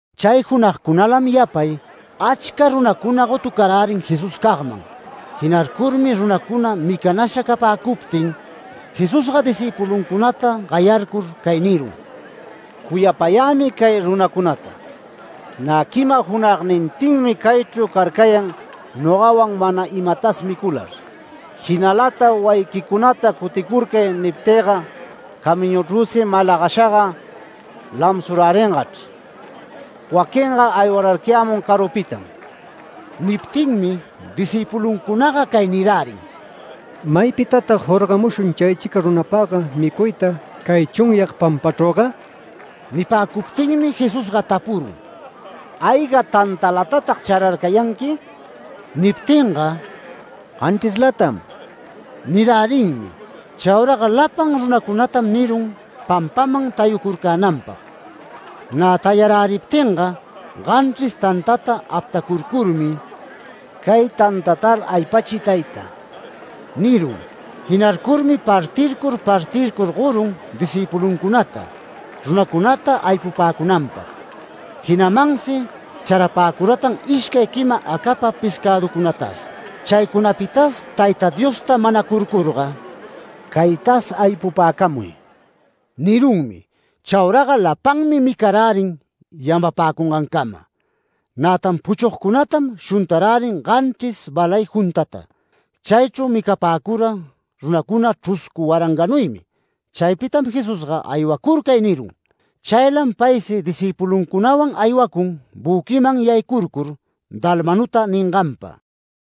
Chay junagcunalam yapay, achca runacuna gotucarärin Jesuscagman. Jinarcurmi runacuna micanasha capäcuptin Jesusga discïpuluncunata gayarcur cay nirun: “Cuyapayämi cay runacunata, nä quima junagnintinmi caychru carcayan nogawan mana imatas micular. Jinalata ‘Wayiquicunata cuticurcay’ niptïga, camiñuchrüsi malagashaga lamsuräringachr. Waquinga aywararcayämun carupitam”. Niptinmi discïpuluncunaga cay nirärin: “¿Maypitatag jorgamushun caychica runapagga micuyta, cay chunyag pampachrüga?” Nipäcuptinmi Jesusga tapurun: “¿Ayga tantalatatag chararcayanqui?” Niptinga “Ganchrislatam” nirärinmi. Chauraga lapan runacunatam nirun pampaman tayucurcänanpag. Nä tayaräriptinga ganchris tantata aptacurcurmi “Cay tantatar aypachiy Tayta” nirun. Jinarcurmi partircur partircur gorun discïpuluncunata, runacunata aypupäcunanpag. Jinamansi charapäcuratan ishcay quima acapa pescäducunatas. Chaycunapitas Tayta Diosta manacurcurga “Caytas aypupäcamuy” nirunmi. Chauraga lapanmi micarärin yamapacungancama. Nätan puchugcunatam shuntarärin ganchris balay juntata. Chaychru micapäcura runacuna chruscu waranganuymi. Chaypitam Jesusga “Aywacurcay” nirun. Chaylam paysi discïpuluncunawan aywacun büquiman yaycurcur Dalmanuta ninganpa.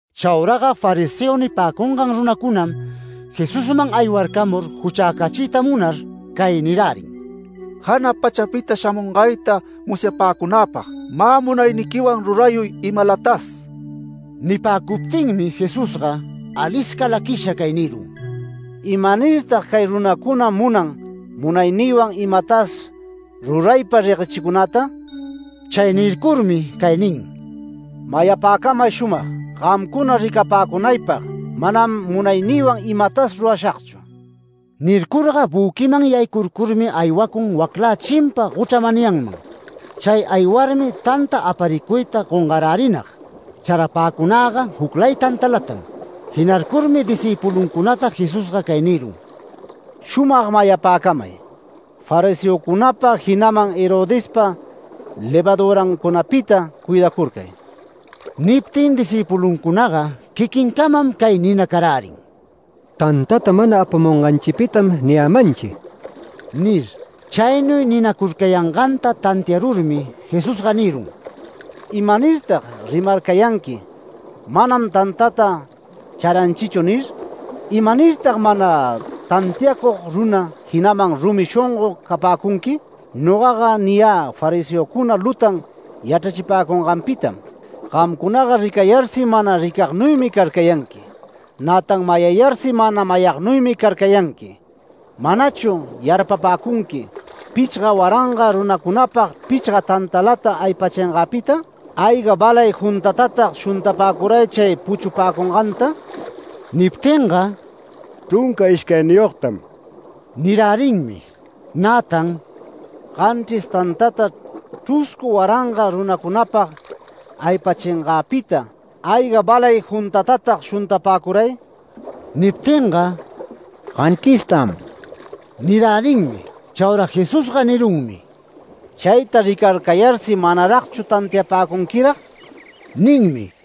Chauraga fariseo nipäcungan runacunam Jesusman aywarcamur juchäcachiyta munar cay nirärin: “Jana pachapita shamungayta musyapäcunäpag, mä munayniquiwan rurayuy imalatas”. Nipäcuptinmi Jesusga alisca laquisha cay nirun: “¿Imanirtag cay runacuna munan munaynïwan imatas ruraypa reguechicunäta?” Chay nircurmi cay nin: “Mayapäcamay shumag: Gamcuna ricapäcunaypag manam munaynïwan imatas rurashagchu”. Nircurga büquinman yaycurcurmi aywacun waclä chimpa gochra manyanman. Chay aywarmi tanta aparicuyta gongarärinag. Charapäcunagga juclay tantalatam. Jinarcurmi discïpuluncunata Jesusga cay nirun: “Shumag mayapäcamay: Fariseocunapa jinaman Herodespa levadurancunapita cuidacurcay”. Niptin discïpuluncunaga quiquincamam cay ninacarärin: “Tantata mana apamunganchipitam niyämanchi” nir. Chaynuy ninacurcayanganta tantiarurmi Jesusga nirun: “¿Imanirtag rimarcayanqui: ‘Manam tantata charanchichu’ nir? ¿Imanirtag mana tantiacug runa, jinaman rumi shongo capäcunqui? Nogaga niyä fariseocuna lutan yachrachipäcunganpitam. Gamcunaga ricayarsi mana ricagnuymi carcayanqui. Nätan mayayarsi mana mayagnuymi carcayanqui. ¿Manachu yarpapäcunqui pichga waranga runacunapag pichga tantalata aypäshingäpita? ¿Ayga balay juntatatag shuntapäcuray chay puchupäcunganta?” Niptinga “Chrunca ishcayniyogtam” nirärinmi. Nätan “Ganchris tantata chruscu waranga runacunapag aypäshingäpita, ¿ayga balay juntatatag shuntapäcuray?” Niptinga “Ganchristam” nirärinmi. Chaura Jesusga nirunmi: “Chayta ricararcayarsi ¿manaragchu tantiapäcunquirag?” ninmi.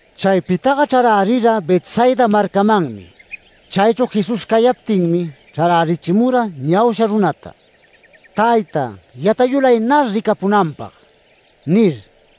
Chaypitaga chrarärira Betsaida marcamanmi. Chaychru Jesús cayaptinmi chrarärichimura ñausha runata, “Tayta, yatayulaynar ricapunanpag” nir.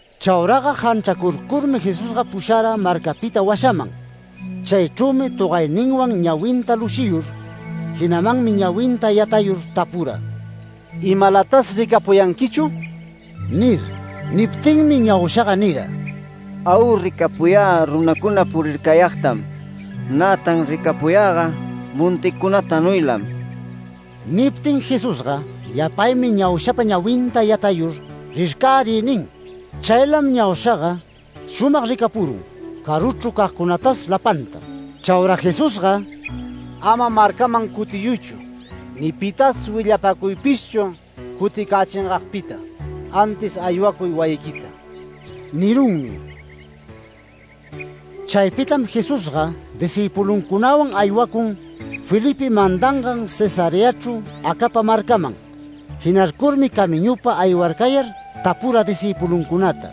Chauraga janchracurcurmi Jesusga pushara marcapita washaman. Chaychrümi togayninwan ñawinta lushiyur, jinamanmi ñawinta yatayur tapura: “¿Imalatas ricapuyanquichu?” nir. Niptinmi ñaushaga nira: “Au ricapuyä runacuna purircayagtam, nätan ricapuyäga monticunatanuylam”. Niptin Jesusga yapaymi ñaushapa ñawinta yatayur “Rircäriy” nin. Chaylam ñaushaga shumag ricapun, caruchru cagcunatas lapanta. Chaura Jesusga “Ama marcaman cutiyuychu, [ni pitas willapacuypishchu cuticächingagpita]. Antis aywacuy wayiquita” nirunmi. Chaypitam Jesusga discïpuluncunawan aywacun Felipe mandangan Cesareachru acapa marcaman. Jinarcurmi camiñupa aywarcayar tapura discïpuluncunata: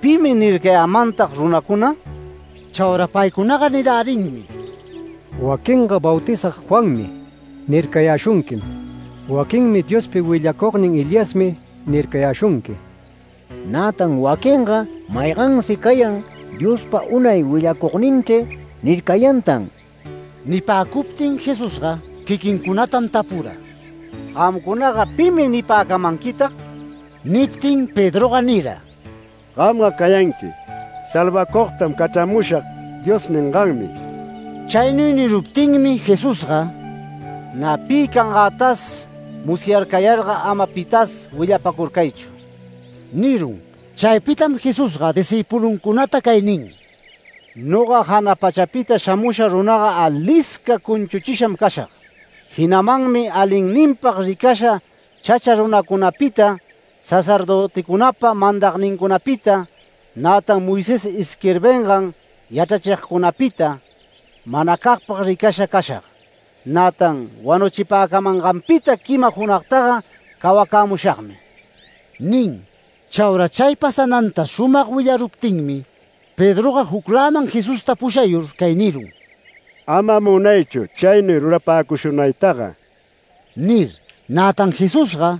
“¿Pimi nircayämantag runacuna?” Chaura paycunaga nirärinmi: “Waquinga ‘Bautizag Juanmi’ nircayäshunquim. Waquinmi ‘Diospa willacugnin Eliasmi’ nircayäshunqui. Nätan waquinga maygansi cayan ‘Diospa unay willacugninchri’ nircayantan”. Nipäcuptin Jesusga quiquincunatam tapura: “Gamcunaga, ¿pimi nipäcamanquitag?” Niptin Pedroga nira: “Gamga cayanqui ‘Salvacugtam cachramushag’ Dios ninganmi”. Chaynuy niruptinmi Jesusga “Nä pi cangätas musyarcayarga ama pitas willapacurcaychu” nirun. Chaypitam Jesusga discïpuluncunata cay nin: “Noga jana pachapita shamusha runaga alisca cunchuchisham cashag. Jinamanmi alinninpag ricasha chacha runacunapita, sacerdöticunapa mandagnincunapita, nätan Moisés isquirbingan yachrachigcunapita, manacagpag ricasha cashag. Nätan wanuchipäcamanganpita quima junagtaga cawacämushagmi” nin. Chaura chay pasananta shumag willaruptinmi Pedroga jucläman Jesusta pushayur cay nirun: “Ama munaychu chaynuy rurapäcushunaytaga” nir. Nätan Jesusga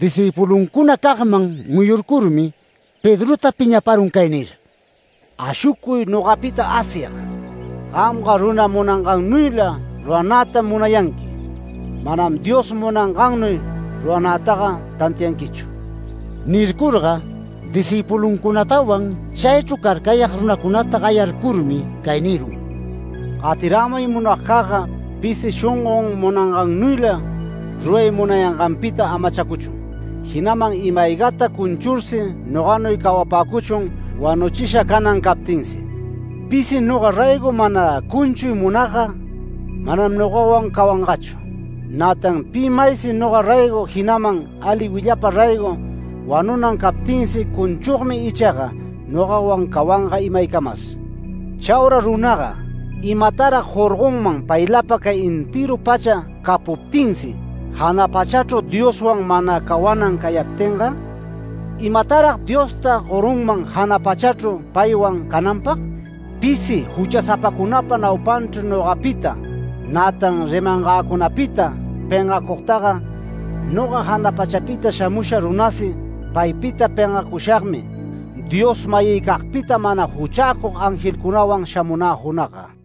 discïpuluncunacagman muyurcurmi Pedrota piñaparun cay nir: “¡Ashucuy nogapita Asyag! Gamga runa munangannuyla ruranätam munayanqui, manam Dios munangannuy ruranätaga tantianquichu”. Nircurga discïpuluncunatawan chaychru carcayag runacunata gayarcurmi cay nirun: “Gatirämay munagcagga, pisi shongon munangannuyla ruray munayanganpita amachacuchun. Jinaman ima-aygata cunchursi noganuy cawapäcuchun wanuchisha canan captinsi. Pisi noga raygo mana cunchuy munagga, manam nogawan cawangachu. Nätan pi maysi noga raygo, jinaman ali willapa raygo wanunan captinsi cunchugmi ichaga, nogawan cawanga imaycamas. Chaura runaga ¿imatarag jorgonman paylapa cay entëru pacha capuptinsi, jana pachachru Dioswan mana cawan cayaptinga? ¿Imatarag Diosta gorunman jana pachachru paywan cananpag? Pisi juchasapacunapa naupanchru nogapita, nätan rimangäcunapita pengacugtaga, noga jana pachapita shamusha runasi paypita pengacushagmi, Dios-mayïcagpita mana juchäcug angelcunawan shamunä junagga”.